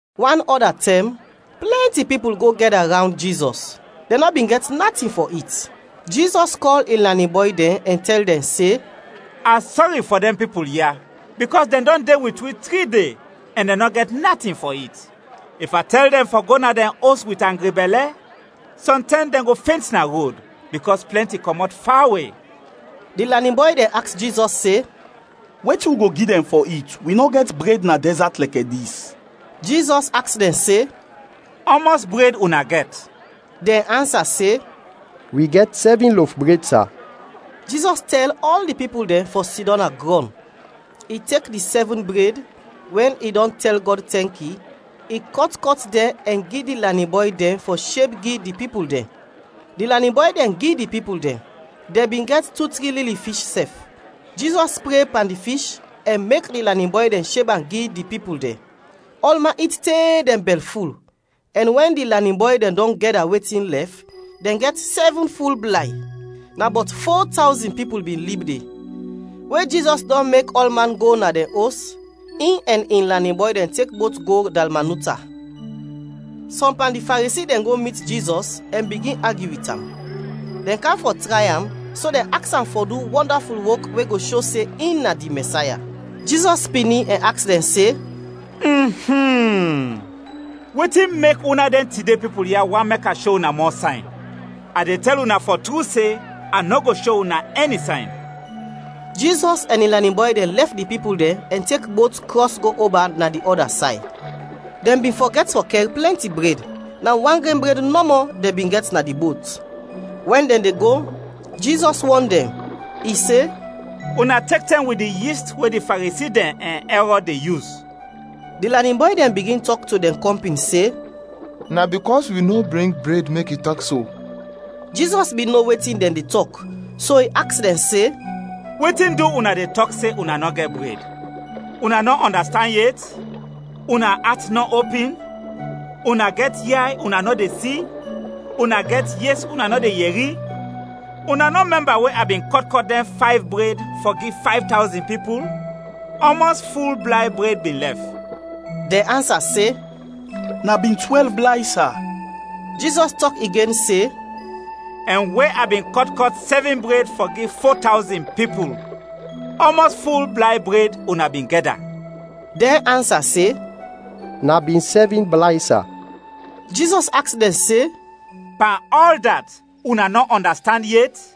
Wan ɔda tɛm, plɛnti pipul bin go gɛda rawnd Jizɔs. Dɛn nɔ bin gɛt natin fɔ it. Jizɔs kɔl in lanin bɔy dɛn ɛn tɛl dɛn se, “A sɔri fɔ dɛn pipul ya bikɔs dɛn dɔn de wit wi tri de ɛn dɛn nɔ gɛt natin fɔ it; if a tɛl dɛn fɔ go na dɛn os wit angri bɛlɛ, sɔntɛm dɛn go fent na rod, bikɔs plɛnti kɔmɔt fawe.” Di lanin bɔy dɛn aks Jizɔs se, “Wetin wi go gi dɛn fɔ it, wi nɔ gɛt bred na dɛzat lɛkɛ dis.” Jizɔs aks dɛn se, “Ɔmɔs bred una gɛt?” Dɛn ansa se, “Wi gɛt sɛvin lof bred, sa!” Jizɔs tɛl ɔl di pipul dɛn fɔ sidɔm na grɔn, i tek di sɛvin bred, wɛn i dɔn tɛl Gɔd tɛnki, i kɔt kɔt dɛn ɛn gi di lanin bɔy dɛn fɔ sheb gi di pipul dɛn. Di lanin bɔy dɛn gi di pipul dɛn. Dɛn bin gɛt tu-tri lili fish sɛf. Jizɔs pre pan di fish ɛn mek di lanin bɔy dɛn sheb am gi di pipul dɛn. Ɔlman it te dɛn bɛlful, ɛn wɛn di lanin bɔy dɛn dɔn gɛda wetin lɛf, dɛn gɛt sɛvin ful blay. Na bɔt fo tawzin pipul bin lib de. We Jizɔs dɔn mek ɔlman go na dɛn os, in ɛn in lanin bɔy dɛn tek bot go Dalmanuta. Sɔm pan di Faresi dɛn go mit Jizɔs ɛn bigin agyu wit am. Dɛn kam fɔ tray am so dɛn aks am fɔ du wɔndaful wok we go sho se in na di Mɛsaya. Jizɔs pini ɛn aks dɛn se, “Wetin mek una dɛn tide pipul ya want mek a sho una mɔ sayn? A de tɛl una fɔ tru se a nɔ go sho una ɛni sayn.” Jizɔs ɛn in lanin bɔy dɛn lɛf di pipul dɛn ɛn tek bot krɔs go oba na di ɔda say. Dɛn bin fɔgɛt fɔ kɛr plɛnti bred, na wan gren bred nɔmɔ dɛn bin gɛt na di bot. Wɛn dɛn de go, Jizɔs wɔn dɛn. I se, “Una tek tɛm wit di yist we di Faresi dɛn ɛn Ɛrɔd de yus.” Di lanin bɔy dɛn bigin tɔk to dɛn kɔmpin se, “Na bikɔs wi nɔ bring bred mek i tɔk so!” Jizɔs bin no wetin dɛn de tɔk, so i aks dɛn se, “Wetin du una de tɔk se una nɔ gɛt bred? Una nɔ ɔndastand yet? Una at nɔ opin? Una gɛt yay, una nɔ de si? Una gɛt yes, una nɔ de yɛri? Una nɔ mɛmba we a bin kɔt kɔt dɛn fayv bred fɔ gi fayv tawzin pipul? Ɔmɔs ful blay bred bin lɛf?” Dɛn ansa se, “Na bin twɛlv blay, sa!” Jizɔs tɔk igen se, “Ɛn we a bin kɔt kɔt sɛvin bred fɔ gi fo tawzin pipul, ɔmɔs ful blay bred una bin gɛda?” Dɛn ansa se, “Na bin sɛvin blay, sa!” Jizɔs aks dɛn se, “Pan ɔl dat, una nɔ ɔndastand yet?”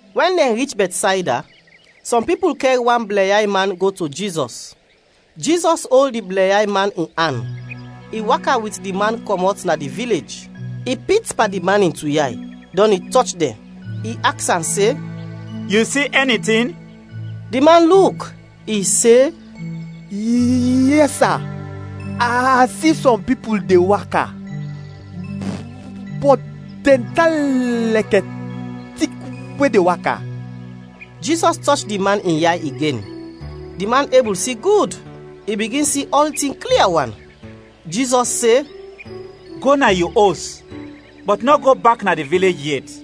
Wɛn dɛn rich Bɛtsayda, sɔm pipul kɛr wan blɛnyay man go to Jizɔs. Jizɔs ol di blɛnyay man in an, i waka wit di man kɔmɔt na di vilej. I pit pan di man in tu yay, dɔn i tɔch dɛn. I aks am se, “Yu si ɛni tin?” Di man luk, i se, “Yɛs, sa, a si sɔm pipul de waka, bɔt dɛn tan lɛkɛ tik we de waka.” Jizɔs tɔch di man in yay igen. Di man ebul si gud, i bigin si ɔltin klia wan. Jizɔs se, “Go na yu os, bɔt nɔ go bak na di vilej yet!”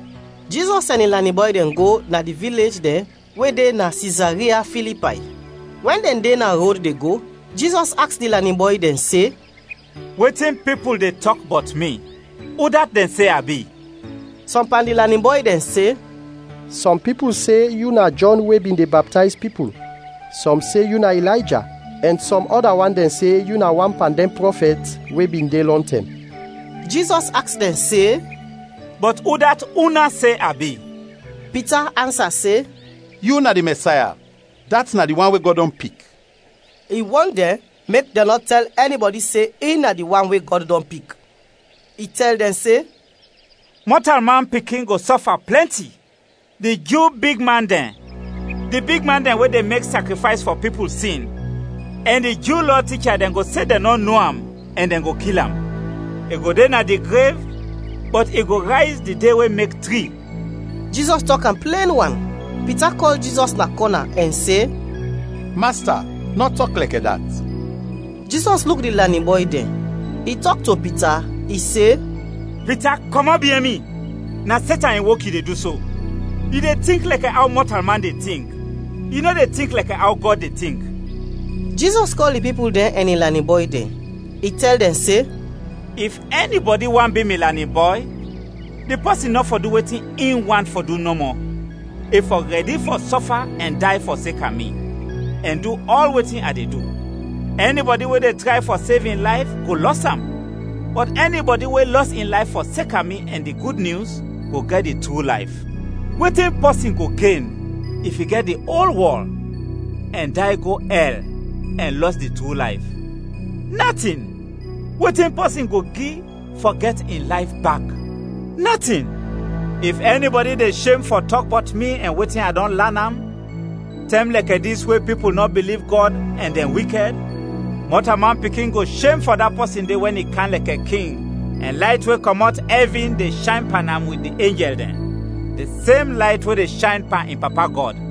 Jizɔs ɛn in lanin bɔy dɛn go na di vilej dɛn we de na Sizaria Filipay. Wɛn dɛn de na rod de go, Jizɔs aks di lanin bɔy dɛn se, “Wetin pipul de tɔk bɔt mi, udat dɛn se a bi?” Sɔm pan di lanin bɔy dɛn se, “Sɔm pipul se yu na Jɔn we bin de baptayz pipul; sɔm se yu na Ilayja, ɛn sɔm ɔda wan dɛn se yu na wan pan dɛn prɔfɛt we bin de lɔntɛm.” Jizɔs aks dɛn se, “Bɔt udat una se a bi?” Pita ansa se, “Yu na di Mɛsaya, dat na di wan we Gɔd dɔn pik!” I wɔn dɛn mek dɛn nɔ tɛl ɛnibɔdi se in na di wan we Gɔd dɔn pik. I tɛl dɛn se, “Mɔtalman Pikin go sɔfa plɛnti. Di Ju bigman dɛn, di bigman dɛn we de mek sakrifays fɔ pipul sin, ɛn di Ju Lɔ ticha dɛn go se dɛn nɔ no am ɛn dɛn go kil am. I go de na di grev, bɔt i go rayz di de we mek tri.” Jizɔs tɔk am plen wan, Pita kɔl Jizɔs na kɔna ɛn se, “Masta, nɔ tɔk lɛkɛ dat!” Jizɔs luk di lanin bɔy dɛn, i tɔk to Pita, i se, “Pita, kɔmɔt biɛn mi, na Setan in wok yu de du so! Yu de tink lɛkɛ aw mɔtalman de tink, yu nɔ de tink lɛkɛ aw Gɔd de tink.” Jizɔs kɔl di pipul dɛn ɛn in lanin bɔy dɛn; i tɛl dɛn se, “If ɛnibɔdi want bi mi lanin bɔy, di pɔsin nɔ fɔ du wetin in want fɔ du nɔmɔ, i fɔ rɛdi fɔ sɔfa ɛn day fɔseka mi, ɛn du ɔl wetin a de du. Ɛnibɔdi we de tray fɔ sev in layf, go lɔs am; bɔt ɛnibɔdi we lɔs in layf fɔseka mi ɛn di Gud Nyus, go gɛt di tru layf. Wetin pɔsin go gen if i gɛt di ol wɔl, ɛn day go ɛl ɛn lɔs di tru layf? Natin! Wetin pɔsin go gi fɔ gɛt in layf bak? Natin! If ɛnibɔdi de shem fɔ tɔk bɔt mi ɛn wetin a dɔn lan am, tɛm lɛkɛ dis we pipul nɔ biliv Gɔd ɛn dɛn wikɛd, Mɔtalman Pikin go shem fɔ da pɔsin de wɛn i kam lɛkɛ King ɛn layt we kɔmɔt ɛvin de shayn pan am wit di enjɛl dɛn; di sem layt we de shayn pan in Papa Gɔd.”